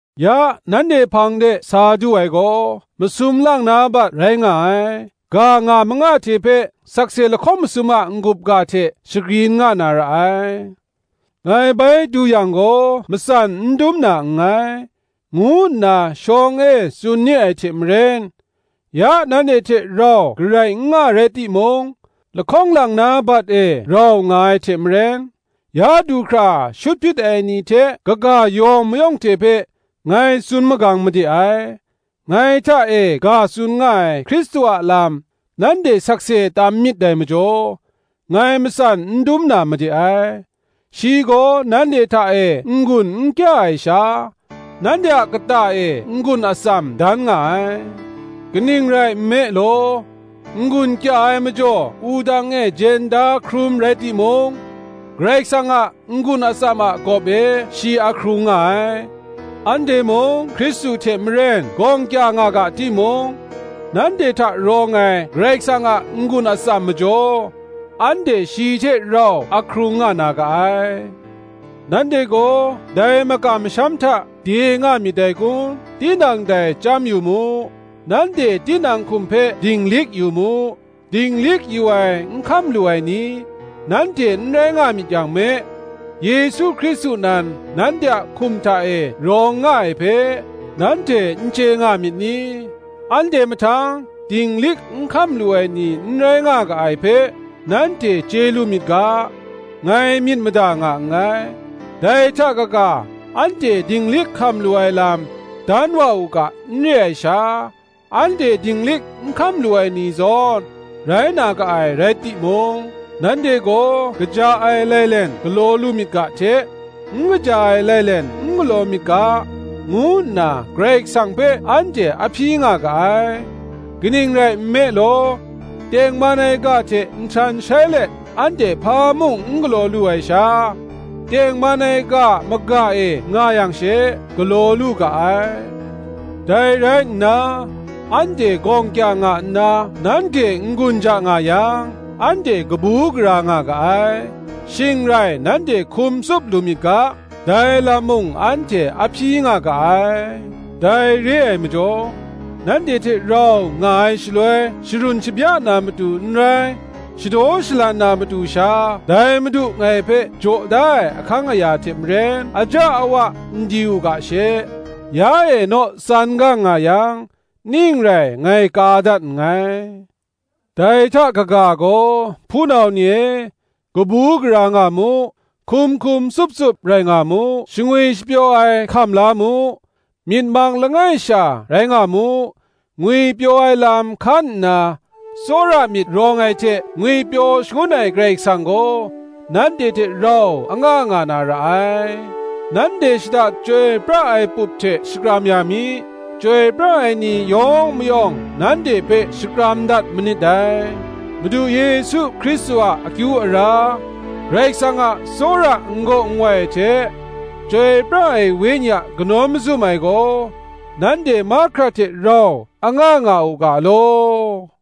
Ya nanhte hpang de sa du ai gaw, masum lang na bat rai nga ai. Ga nga manga hte hpe, sakse lahkawng masum a n-gup ga hte shagrin nga na ra ai. Ngai bai du yang gaw matsan n dum na nngai, ngu nna shawng e tsun ni ai hte maren, ya nanhte hte rau garai n nga rai timung, lahkawng lang na bat e rau nga ai hte maren, ya du hkra shut hpyit ai ni hte kaga yawng mayawng hte hpe, ngai tsun magang made ai; ngai hta e ga tsun nga ai Hkristu a lam nanhte sakse tam myit dai majaw, ngai matsan n dum na made ai. Shi gaw nanhte hta e n-gun n kya ai sha, nanhte a kata e n-gun atsam dan nga ai: kaning rai nme law, n-gun kya ai majaw wudang e jen da hkrum rai timung, Karai Kasang a n-gun atsam a gawp e shi ahkrung nga ai. Anhte mung Hkristu hte maren gawng kya nga ga timung, nanhte hta rawng ai Karai Kasang a n-gun atsam majaw, anhte shi hte rau ahkrung nga na ga ai. Nanhte gaw dai makam masham hta de nga myit dai kun, tinang dai chyam yu mu; nanhte tinang hkum hpe dinglik yu mu: dinglik yu ai n hkam lu ai ni, nanhte n rai nga myit yang me, Yesu Hkristu nan nanhte a hkum hta e rawng nga ai hpe, nanhte n chye nga myit ni? Anhte mahtang dinglik n hkam lu ai ni n rai nga ga ai hpe, nanhte chye lu myit ga, ngai myit mada nga nngai. Dai hta kaga, anhte dinglik hkam lu ai lam dan wa u ga n re ai sha, anhte dinglik n hkam lu ai ni zawn rai na ga ai rai timung, nanhte gaw kaja ai lailen galaw lu myit ga hte, n kaja ai lai len n galaw myit ga, ngu nna Karai Kasang hpe anhte ahpyi nga ga ai. Kaning rai nme law, tengman ai ga hte nhtan shai let anhte hpa mung n galaw lu ai sha, tengman ai ga a maga e nga yang she, galaw lu ga ai. Dai rai nna, anhte gawng kya nga nna nanhte n-gun ja nga yang, anhte kabu gara nga ga ai: shing rai nanhte hkum tsup lu myit ga, dai lam mung anhte ahpyi nga ga ai. Dai re ai majaw, nanhte hte rau nga ai shaloi sharun shabya na matu n rai, shadaw shalan na matu sha dai Madu ngai hpe jaw da ai ahkang aya hte maren, aja awa n di u ga she, ya e naw tsan gang nga yang, ning rai ngai ka dat nngai. Dai hta kaga gaw, hpunau ni e, kabu gara nga mu; hkum hkum tsup tsup rai nga mu; shangwi shapyaw ai hkam la mu; myit mang langai sha rai nga mu; ngwipyaw ai lam hkan nna, tsawra myit rawng ai hte ngwipyaw shangun ai Karai Kasang gaw nanhte hte rau anga nga na ra ai. Nanhte shada chyoi pra ai pup hte shakram ya mi. Chyoi pra ai ni yawng mayawng nanhte hpe shakram dat manit dai. Madu Yesu Hkristu a akyu ara, Karai Kasang a tsawra n-gaw nwai ai hte, Chyoi pra ai Wenyi a kanawn mazum ai gaw, nanhte mahkra hte rau anga nga u ga law.